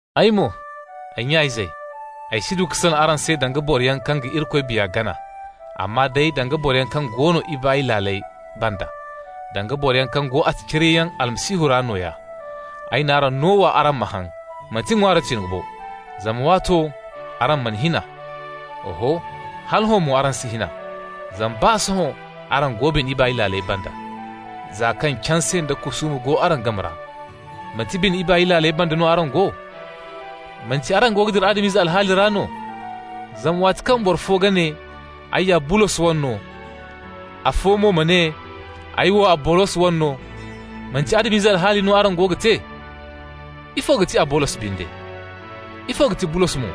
Ay mo, ay nya-izey, ay si du ka salaŋ araŋ se danga boroyaŋ kaŋ ga Irikoy Biya gana, amma day danga boroyaŋ kaŋ go bine ibaay laaley banda, danga boroyaŋ kaŋ go attaciriyayaŋ Almasihu ra nooya. Ay n'araŋ no wa araŋ ma haŋ, manti ŋwaari tiŋo bo, zama waato araŋ mana hin a. Oho, hala hõ mo araŋ si hin a, zama baa sohõ araŋ go bine ibaay laaley banda. Za kaŋ canse nda kusuuma go araŋ game ra, manti bine ibaay laaley banda no araŋ go? Manti araŋ go ga dira Adam-ize alhaali ra no? Zama waati kaŋ araŋ boro fo go ga ne: «Ay ya Bulos wane no!» Afo mo ma ne: «Ay wo Abolos wane no!» Manti Adam-ize alhaali no araŋ go ga te? Ifo ga ti Abolos binde? Ifo ga ti Bulos mo?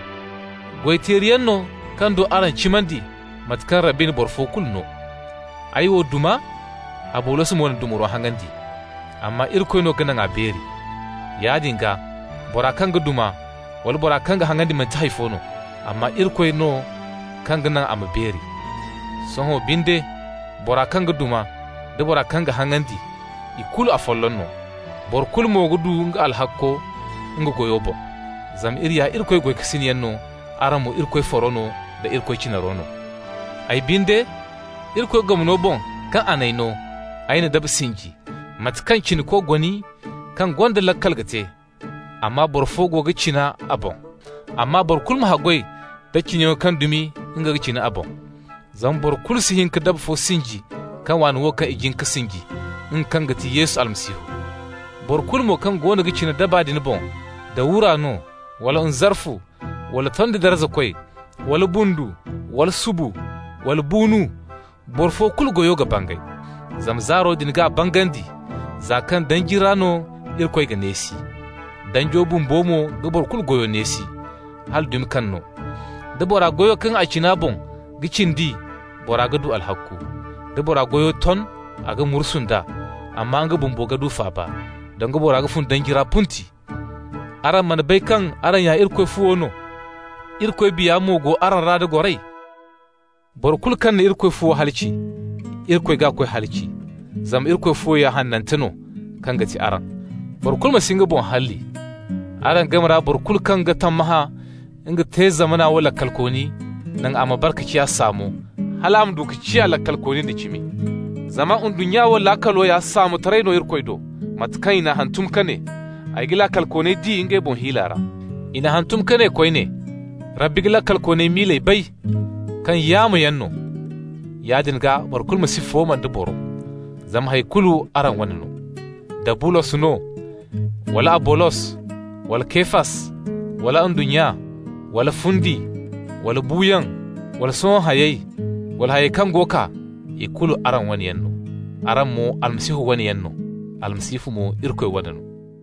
Goy-teeriyaŋ no kaŋ do araŋ cimandi, mate kaŋ Rabbi na boro fo kulu no. Ay wo duma, Abolos mo na dumaro haŋandi, amma Irikoy no ka naŋ a beeri. Yaadin gaa, bora kaŋ ga duma wala bora kaŋ ga haŋandi manti hay fo no, amma Irikoy no kaŋ ga naŋ a ma beeri. Sohõ binde, bora kaŋ ga duma nda bora kaŋ ga haŋandi, i kulu afolloŋ no, boro kulu mo ga du nga alhakko nga goyo boŋ. Zama iri ya Irikoy goykasinyaŋ no, araŋ mo Irikoy faro da Irikoy cinaro no. Ay binde, Irikoy gomno boŋ kaŋ a n'ay no, ay na daba sinji, mate kaŋ cinako goni kaŋ gonda laakal ga te, amma boro fo go ga cina a boŋ. Amma boro kulu ma haggoy da cinayaŋo kaŋ dumi nga ga cina a boŋ. Zama boro kulu si hin ka daba fo sinji, kaŋ waana wo kaŋ i jin ka sinji, nga kaŋ ti Yesu Almasihu. Boro kulu mo kaŋ goono ga cina daba din boŋ, da wura no, wala nzarfu, wala tondi darzakoy, wala bundu, wala subu, wala buunu -- boro fo kulu goyo ga bangay. Zama zaaro din g'a bangandi, za kaŋ danji ra no Irikoy g'a neesi. Danjo bumbo mo ga boro kulu goyo neesi, hala dumi kaŋ no. Da bora goyo kaŋ a cina a boŋ ga cindi, bora ga du alhakku. Da bora goyo ton, a ga mursu nd'a, amma nga bumbo ga du faaba, danga boro kaŋ fun danji ra punti. Araŋ mana bay kaŋ araŋ ya Irikoy fuwo no, Irikoy Biya mo go araŋ ra da goray? Boro kulu kaŋ na Irikoy fuwo halaci, Irikoy g'a koy halaci, zama Irikoy fuwo ya hanante no, kaŋ ga ti araŋ. Boro kulu ma si nga boŋ halli. Araŋ game ra boro kulu kaŋ ga tammahã nga te zamana wo laakalkooni, naŋ a ma bare ka ciya saamo, hal a ma du ka ciya laakalkooni nda cimi. Zama ndunnya wo laakalo ya saamotaray no Irikoy do, mate kaŋ i n'a hantum ka ne: «Ay ga laakalkooney di ngey boŋ hiila ra.» I n'a hantum ka ne koyne: «Rabbi ga laakalkooney miiley bay, kaŋ yaamoyaŋ no.» Yaadin gaa, boro kulu ma si fooma nda boro! Zama hay kulu araŋ wane no. Da Bulos no, wala Abolos, wala Kefas, wala ndunnya, wala fundi, wala buuyaŋ wala sohõ hayey, wala hayey kaŋ go kaa -- i kulu araŋ wane yaŋ no. Araŋ mo Almasihu wane yaŋ no, Almasihu mo Irikoy wane no.